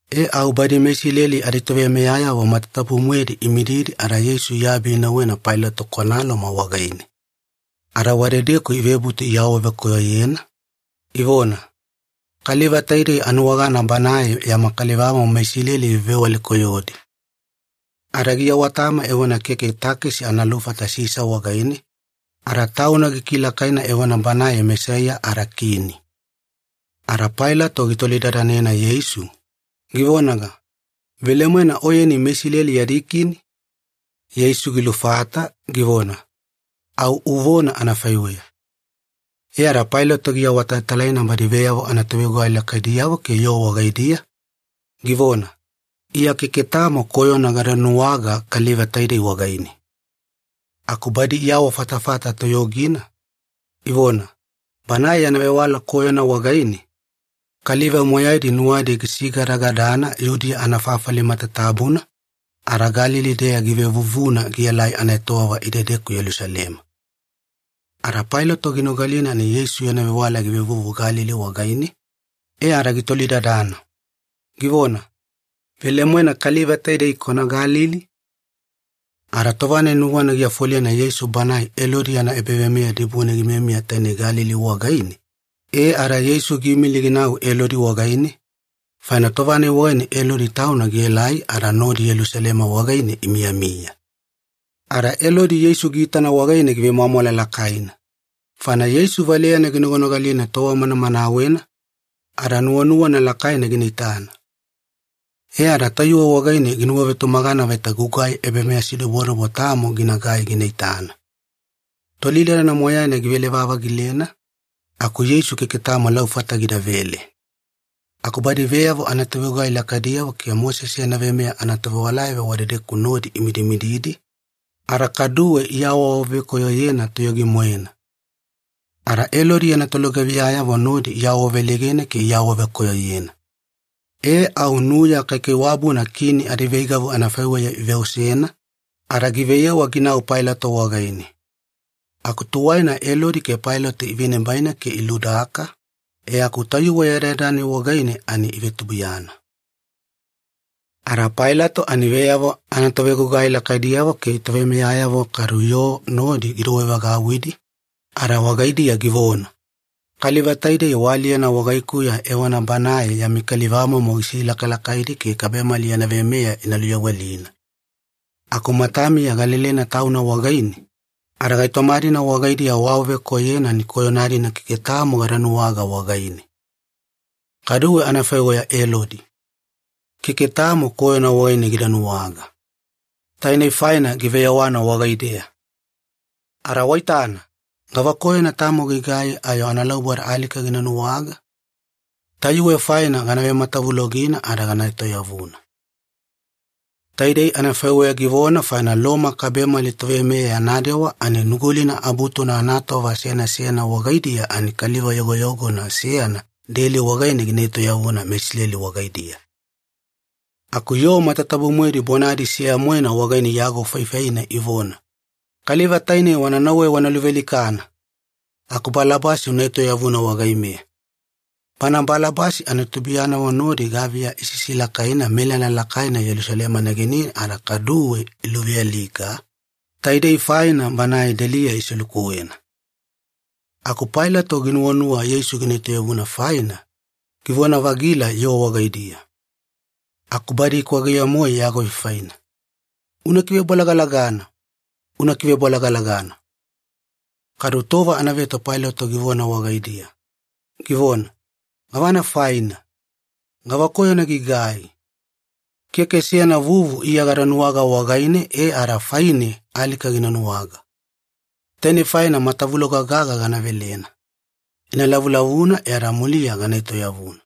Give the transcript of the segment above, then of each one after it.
E au badi meIsileli aditoveimeyayavo matatabu-moedi imididi ada Yeisu iabi inauwena Pailato kwana Loma wagaine. Ada wadedeku ivebutu iawavekoyoyena, ivona, “Kaliva taidei anuwagana Banae yama kalivamomo meIsileli givevewale-koyodi. Ada giawatama evona keke takesi ana lufata Sisa wagaine, ada Tauna gikilakaina evona Banae Mesaiya, ada kini.” Ada Pailato gitolidadanena Yeisu, givonaga, “Velemoena Oyeni meIsileli yadi kini?” Yeisu gilufata, givona, “Au uvona anafaiweya.” E ada Pailato giawatalatalaina badi veyavo anatovegugai lakaidiyavo ke yoo wagaidiya, givona, “Iya keke tamo koyona gada nuwaga kaliva taidei wagaine.” Aku badi iawafatafata toyogina, ivona, “Banae yana vewala koyona wagaine, kaliva moyaidi nuwadi gisigadagadana Yudiya anafafali matatabuna, ada Galili-deya givevuvuna gielai anaetowava idedeku Yelusalema.” Ada Pailato ginogalina ani Yeisu yana vewala givevuvu Galili wagaine, e ada gitolidadana, givona, “Velemoena kaliva taidei kwana Galili?” Ada tova-nai nuwana giafolena Yeisu banae Elodi yana ebaveimeya dibune gimiyamiya tainei Galili wagaine, e ada Yeisu giimili ginau Elodi wagaine, faina tova-nai wagaine Elodi tauna Yelusalema wagaine gimiyamiya. Ada Elodi Yeisu giitana wagaine givemwamwala lakaina, faina tova manamanawena Yeisu valeyana ginoganogalina, ada nuwanuwana lakaina gina itana. E ada tayuwe wagaine ginuwavetumagana vaita gugai ebameyasidobodobo tamo ginagai gina itana. Tolidadana moyaina givele-vavagilena, aku Yeisu keke tamo laufata gidavele. Aku badi veyavo anatovegugai lakaidiyavo ke Mosese yana veimeya anatovewalayavo wadedeku nodi imidimididi, ada kaduwe iawaawavekoyoyena toyogi-moena. Ada Elodi yana tolugaviyayavo nodi iawaveleigena ke iawadamanena. E au nuya kaikaiwabuna kini adiveigavu anafaiweya iveosena, ada giveyewa ginau Pailato wagaine. Aku tuwaina Elodi ke Pailato ivenibaina ke iludaka, e aku tayuwe yadayada-nai wagaine ani ivetubuiyana. Ada Pailato ani veyavo anatovegugai lakaidiyavo ke toveimeyayavo kadu yoo nodi gidouwevagauwidi, ada wagaidiya givona, “Kaliva taidei waaliyena wagaikuya evona banae yami kalivamomo gisilakalakaidi ke kabemali yana veimeya ina luyawelina. Aku matamiya galelena Tauna wagaine, ada gaitoma-dina wagaidiya waawavekoyoyena ani koyona-dina keke tamo gada nuwaga wagaine. Kaduwe anafaiweya Elodi. Keke tamo koyona wagaine gida nuwaga. Tainei faina giveyewana wagaideya. Ada waitana, gavakoyona tamo gigai ayo analauboda alika gina nuwaga? Tayuwe faina gana vematavulogina ada gana etoyavuna.” Taidei anafaiweya givona faina Loma kabemali toveimeya yana dewa ani Nugulina Abutuna anatova seyana seyana wagaidiya ani kaliva yogoyogona seyana deli wagaine gina etoyavuna meIsileli wagaidiya. Aku yoo matatabu-moedi bonadi seya-moena wagaine iagofaifaina ivona, “Kaliva tainei wana nauwe wana luvealikana! Aku Balabasi una etoyavuna wagaimeya!” Bana Balabasi ani tubuiyanavo nodi gaviya isisilakaina melala lakaina Yelusalema negenine ada kaduwe iluvealika, taidei faina banae deliya iselukuwena. Aku Pailato nuwanuwana Yeisu gina etoyavuna faina, givona-vagila yoo wagaidiya. Aku badi ikwageye-moe iagofaifaina, “Una kivebolagalagana! Una kivebolagalagana!” Kadu tova anaveto Pailato givona wagaidiya, givona, “Gavana faina? Gavakoyona gigai? Keke seyana vuvu Iya gada nuwaga wagaine e ada faine alika gina nuwaga. Tainei faina matavuloga gaga gana velena. Ina lavulavuna e ada muliya gana etoyavuna.”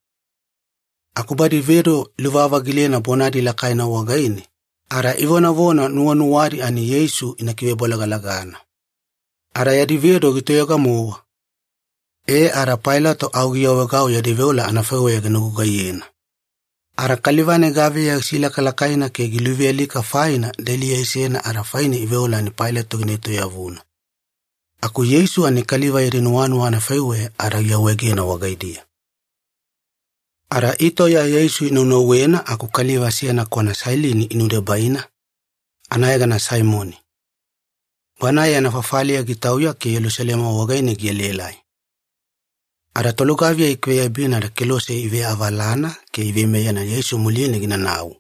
Aku badi vedo iluvavagilena bonadi lakaina wagaine, ada ivonavona nuwanuwadi ani Yeisu ina kivebolagalagana. Ada yadi vedo gitoyoga-mowa. E ada Pailato au giawaegau yadi veola anafaiweya gina gugaiyena. Ada kaliva-nai gaviya gisilakalakaina ke giluvealika faina deliya isena ada faine iveola ani Pailato gietoyavuna. Aku Yeisu ani kaliva yadi nuwanuwa anafaiweya ada giawaegena wagaidiya. Ada itauya Yeisu inaunauwena aku kaliva seyana kwana Sailini inudebaina, anayegana Saimoni. Banae yana fafaliya gitauya ke Yelusalema wagaine gielaelai. Ada tolugaviya ikiveyabina ada kelose iveavalana ke iveimeyena Yeisu muline ginanau.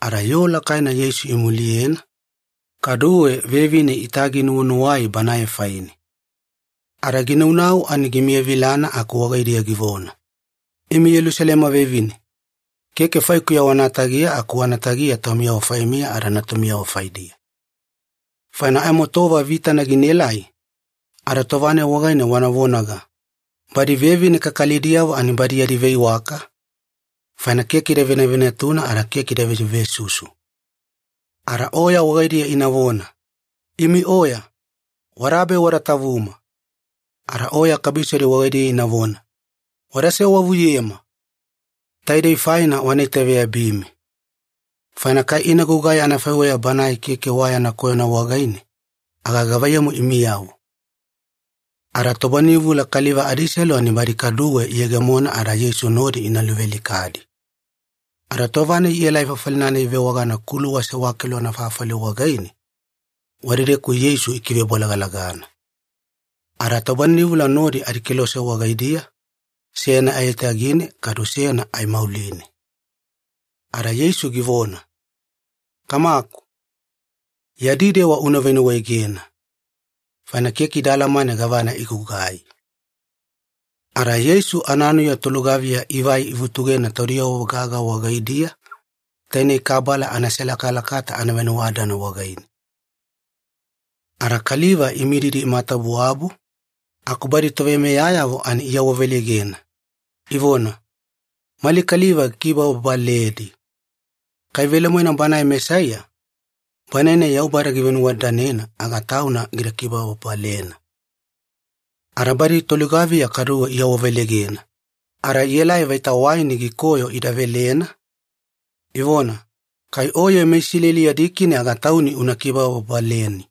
Ada yoo lakaina Yeisu imuliyena, kaduwe vevine itaginuwanuwai Banae faine. Ada ginaunau ani gimiyavilana aku wagaidiya givona, “Imi Yelusalema vevine, keke faikuya wana tagiya aku wana tagiya taumiyavo faimiya ada natumiyavo faidiya. Faina aimo tova vitana ginaelai, ada tova-nai wagaine wana vonaga, ‘Badi vevine kakalidiyavo ani badi yadi veiwaka, faina keke ida venavenatuna ada keke ida vesuvesusu.’ Ada oya wagaidiya inavona, ‘Imi oya, wadabe wada tavuma!’ ada oya kabisodi wagaidiya inavona, ‘Wada sewavuyema!’ Taidei faina wana itaveyabimi. Faina kai ina gugai anafaiweya banae keke wa yana koyona wagaine, aga gavaiyamu imiyavo?” Ada tobaninivula kaliva adiselu ani badi kaduwe iyegemonedi ada Yeisu nodi ina luvealikadi. Ada tova-nai ielai fafali-nai ivewagana ‘Kuluwa Sewakelu Anafafali’ wagaine, wadedeku Yeisu ikivebolagalagana. Ada tobaninivula nodi adikelose wagaidiya, seyana aiyatagine kadu seyana aimauline. Ada Yeisu givona, “Kamaku, yadi dewa una venuwaegena, faina keke ida alamane gavana igugai.” Ada Yeisu ananuya tolugaviya ivai ivutugena taudiyavo gaga wagaidiya, taine kabala anaselakalakata anavenuwadadana wagaine. Ada kaliva imididi imatawabuwabu, aku badi toveimeyayavo ani iawaveleigena, ivona, “Mali kaliva gikibababaledi. Kai velemoena Banae Mesaiya, Banae-nai Yaubada givenuwadadanena, aga Tauna gida kibababalena!” Ada badi tolugaviya kaduwe iawaveleigena, ada ielai vaita waini gikoyo ida velena, ivona, “Kai Oye meIsileli yadi kini aga Tauni una kibababaleni.”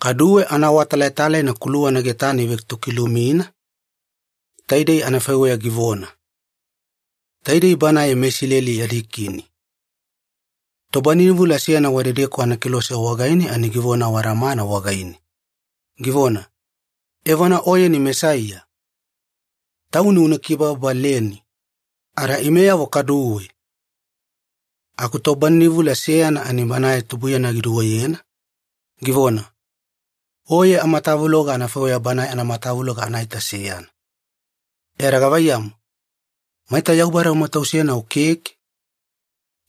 Kaduwe anaawatalatalaina kuluwana getane ivetokilumina, taidei anafaiweya givona, “TAIDEI BANAE MeISILELI YADI KINI.” Tobaninivula seyana wadedeku anakelose wagaine ani givona awadamana wagaine, givona, “Evona Oyeni Mesaiya? Tauni una kibababaleni, ada imeyavo kaduwe!” Aku tobaninivula seyana ani banae tubuiyana giduweyena, givona, “Oye amatavuloga anafaiweya banae anamatavuloga anaita seyana. E ada gavaiyamu, maita Yaubada umatausena o keke?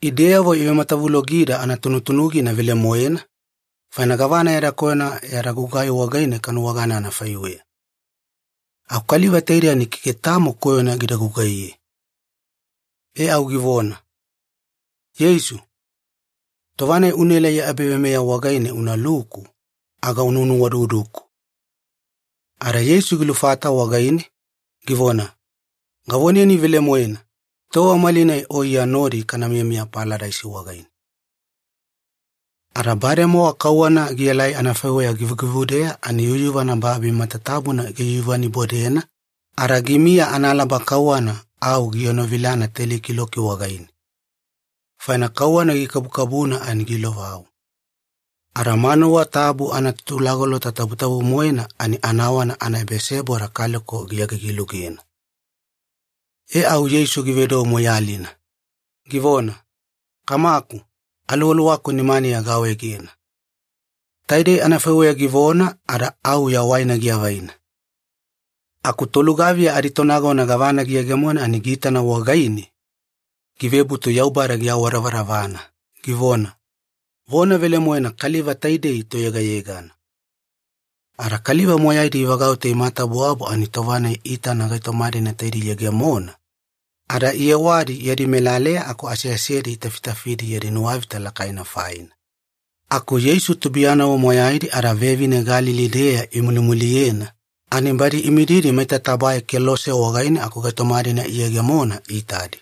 Ideyavo ivematavulogida anatunutunugina velemoena, faina gavana yada koyona yada gugai wagaine kanuwagana anafaiweya. Aku kaliva taidei ani keke tamo koyona gida gugaiye.” E au givona, “Yeisu, tova-nai unaelai ya ebaveimeya wagaine unaluku, aga una nuwaududuku.” Ada Yeisu gilufata wagaine, givona, “Gavoneni velemoena, tova malinai o Iya nodi kana miyamiya Paladaisi wagaine.” Ada bademowa kauwana gielai anafaiweya givugivudeya ani yuyuvana babi matatabuna giyuyuvanibodena, ada gimiya analaba kauwana au gienovilana teli kiloki wagaine. Faina kauwana gikabukabuna ani giilovau. Ada manuwa tabu anaTutulagolota Tabutabu-moena ani anawana anaebaseboda kaleko giagigi-lugena. E au Yeisu givedou moiyalina, givona, “Kamaku, aluwaluwaku nimaniya gaawaegena.” Taidei anafaiweya givona ada au yawaina giavaina. Aku tolugaviya aditonagona gavana giyegemona ani giitana wagaine, givebutu Yaubada giawadavadavana, givona, “Vona velemoena kaliva taidei toyegayegana.” Ada kaliva moyaidi ivagauta imatawabuwabu ani tova-nai iitadi gaitoma-dina taidei iyegemona, ada iyewadi yadi melaleya aku aseasedi itafitafidi yadi nuwavita lakaina faina. Aku Yeisu tubuiyanavo moyaidi ada vevine Galili-deya imulimuliyena, ani badi imididi maita tabae kelose wagaine aku gaitoma-dina iyegemona iitadi.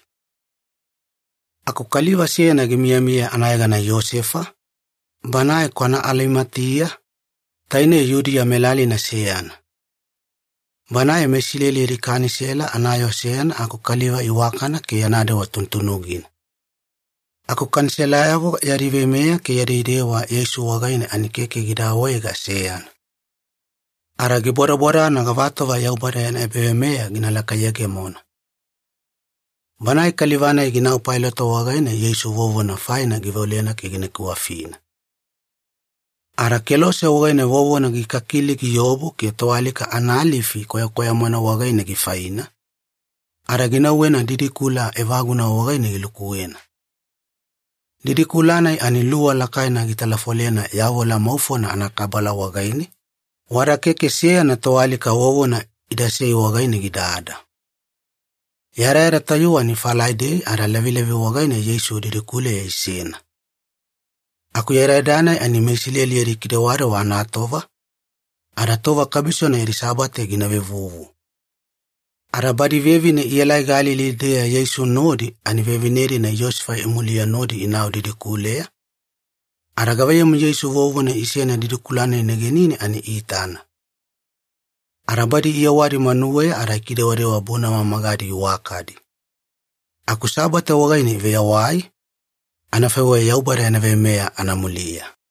Aku kaliva seyana gimiyamiya anayegana Iyosefa, banae kwana Alimatiya, tainei Yudiya melalina seyana. Banae meIsileli yadi Kanisela anayoo seyana aku kaliva iwakana ke yana dewa tunutunugina. Aku Kaniselayavo yadi veimeya ke yadi dewa Yeisu wagaine ani keke gida awaega seyana. Ada gibodabodana gavatova Yaubada yana ebaveimeya gina lakayegemona. Banae kaliva-nai ginau Pailato wagaine Yeisu vovona faina giveolena ke gina kiwafina. Ada kelose wagaine vovona gikakili giobu ke toalika analifi kwayakwaya-moena wagaine gifaina, ada ginauwena didikula evaguna wagaine gilukuwena. Didikula-nai ani luwa lakaina gitalafolena yavola maufona anakabala wagaine, wada keke seyana toalika vovona idasei wagaine gidada. Yadayada tayuwe ani Falaidei ada lavilavi wagaine Yeisu didikuleya isena, aku yadayada-nai ani MeIsileli yadi kidewadewa anatova, ada tova kabisona yadi Sabate gina vevuvu. Ada badi vevine ielai Galili-deya Yeisu nodi ani vevine-dina Iyosefa imuliye nodi inau didikuleya, ada gavaiyamu Yeisu vovona isena didikula-nai negenine ani iitana. Ada badi iyewadi manuweya ada ikidewadewa bunama magadi iwakadi. Aku Sabate wagaine iveyawai, anafaiweya Yaubada yana veimeya anamuliya.